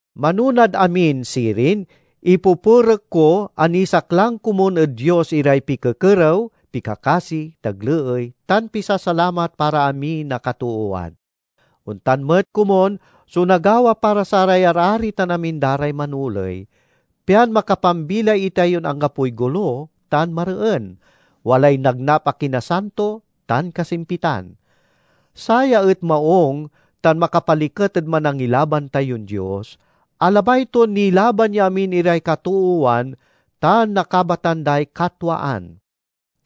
Manonad amin, sirin, ipupurek ko a nisaklang komun ed Dios iray pikekerew, pikakasi, tagleey, tan pisasalamat para amin a katoowan. Ontan met komun so nagawa para saray arari tan amin da ray manoley, pian makapambilay itayon anggapoy golo tan mareen, walay nagnap a kinasanto tan kasimpitan. Saya et maung tan makapaliket ed Manangilaban tayon Dios, a labay ton nilaban ya amin iray katoowan tan nakabatan day katwaan.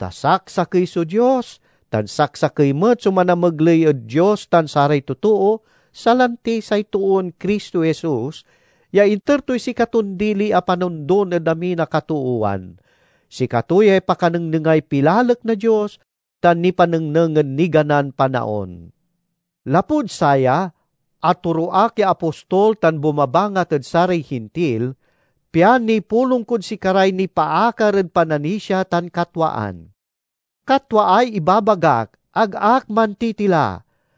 Ta saksakey so Dios, tan saksakey met so manamegley ed Dios tan saray totoo, salanti say toon Cristo Jesus, ya inter toy sikaton dili a panondon ed amin a katoowan. Sikato yay pakanengnengay pilalek na Dios, tan nipanengneng ed niganan panaon. Lapud saya, atoro ak ya apostol tan bumabangat ed saray Hintil, pian nipulong kod sikaray nipaakar ed pananisia tan katwaan. Katwaay ibabagak, ag ak mantitila!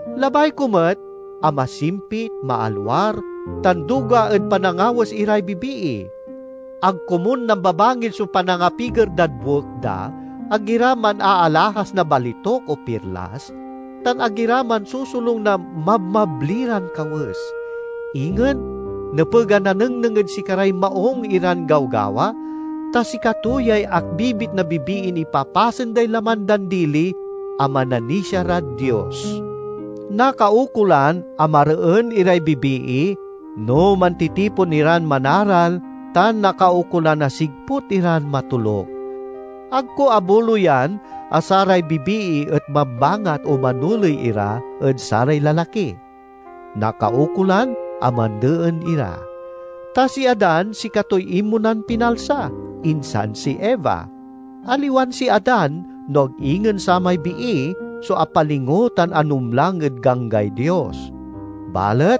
Labay ko met a masimpit, maalwar, tan duga ed panangawes iray bibii. Ag komun nambabangil so panangapiger dad buek da, ag ira manaalahas na balituk o pirlas, tan ag ira mansosolung na mabmabli ran kawes. Ingen nepeg a nanengneng ed sikaray maung iran gawgawa, ta sikato yay akbibit na bibiin ipapasen day laman dan dili a mananisia rad Dios. Nakaukolan a mareen iray bibii no mantitipon iran manaral tan nakaukolan a sigput iran matoluk. Ag ko abuloyan a saray bibii et mambangat o manoley ira ed saray lalaki; nakaukolan a mandeen ira. Ta si Adan sikatoy inmonan pinalsa, insan si Eva. Aliwan si Adan no ag ingen samay bii so apalingo tan anumlang ed ganggay Dios. Balet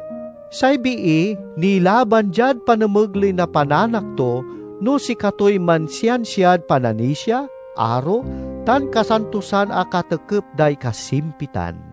say bii nilaban diad panamegley na pananak to, no sikatoy mansiansiad pananisia, aro, tan kasantosan a katekep day kasimpitan.